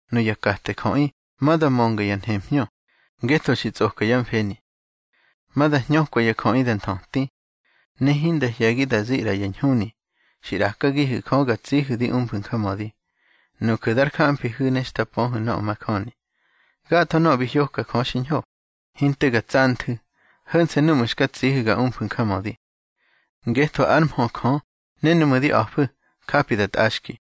Nuya kate jöꞌi ma da mönga ya nhemhñö, ngetho xi tsꞌoka yá mfeni. Ma da hñökwa ya jöꞌi da nthöti. Ne hinda hye̱gi da zi ꞌra ya ñhuni xi ꞌrakagihu̱ Jö ga tsihu̱ di umfu̱ njamödi, nuju̱ dar gamfihu̱ ne xta pöhu̱ nöꞌö majöni. Gatho nöꞌö bi hyoka Jö xiñho, hinte ga tsanthu̱, ho̱nse̱ núꞌmu̱ xka tsihu̱ ga umfu̱ njamödi. Ngetho ár mhö Jö ne núꞌmu̱ di a̱fu̱, japi da tꞌaxki.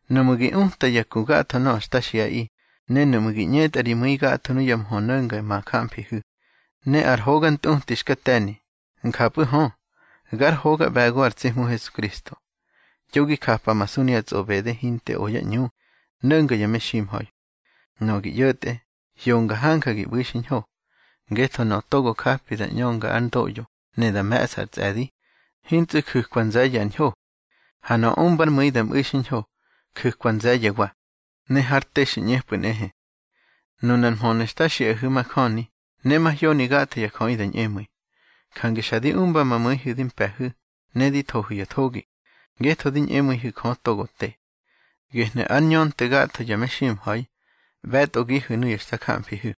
Nuꞌmu̱ gi uta ya ku gatho nöꞌö xta xiꞌaꞌi, ne nuꞌmu̱ gi ꞌñetꞌa ri mu̱i gatho nuya mhö no̱nga ma jamfihu̱, ne ar hoga ntꞌuti xka te̱ni, njapꞌu̱ hö, gár hoga ꞌbe̱go ar tsi Hmu Hesukristo. Yo gi japamasu nuya tsꞌoꞌbede hinte o yá ꞌñu no̱nga ya meximha̱i. Nöꞌö gi ꞌyo̱tꞌe, hyonga hanja gi ꞌbu̱i xiñho. Ngetho nöꞌö togo japi da ꞌñönga ár ndoꞌyo ne da me̱ꞌsa ar tsꞌe̱di, hintsꞌu̱ ju̱kwa nze̱ye̱ ar ñho. Ha nöꞌö umbár mu̱i da mꞌu̱i xiñho, ju̱kwa nze̱ye̱wa, ne har te xi ꞌñepꞌu̱ nꞌehe. Nunar mhönu̱ xta xiꞌahu̱ majöni, ne mahyoni gatho ya jöꞌi da ñꞌemu̱i. Jange xa di umba ma mu̱ihu̱ di mpe̱hu̱, ne di thohu̱ ya thogi, ngetho di ñꞌemu̱ihu̱ Jö togo te. Gehnu̱ ár ñönte gatho ya meximha̱i, ꞌbe̱tꞌogihu̱ nuya xta jamfihu̱.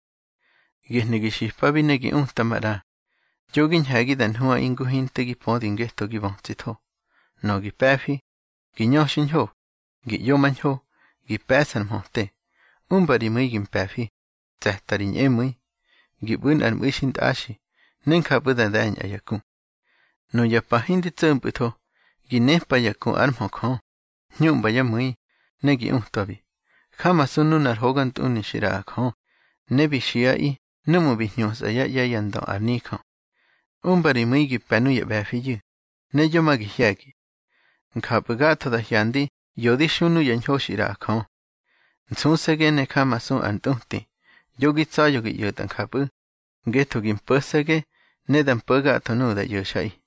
Gehnu̱ gi xipabi ne gi uta maꞌra. Yo gi ñhe̱gi da nhuꞌaꞌi ngu hinte gi pödi ngetho gi bötsitho. Nöꞌö gi pe̱fi: Gi ñö xiñho, gi ꞌyomañho, gi pe̱ꞌsa ar mhöte, umba ri mu̱i gi mpe̱fi, tse̱ta ri ñꞌemu̱i, gi ꞌbu̱ nꞌar mꞌu̱i xintꞌaxi, ne njapꞌu̱ da de̱ñꞌa ya ku. Nuya pa hindi tso̱mpꞌu̱tho, gi népa ya ku ár mhö Jö, hñuꞌmba yá mu̱i, ne gi utwabi. Jamasu nunar hogantꞌuni xi ꞌraꞌa Jö, ne bi xiꞌaꞌi núꞌmu̱ bi hñusꞌa yá ꞌye̱ yá ndö ar nijö. Umba ri mu̱i gi pe̱ nuya ꞌbe̱fiyu̱, ne yo ma gi hye̱gi. Njapꞌu̱ gatho da hyandi ꞌyo di xu nuya ñho xi ꞌraꞌa Jö. Nsuse̱ge ne jamasu ar ntꞌuti. Yo gi tsa̱ya̱ gi ꞌyo̱tꞌa njapꞌu̱, ngetho gi mpo̱se̱ge, ne da mpo̱ gatho nuꞌu̱ da ꞌyo̱xꞌaꞌi.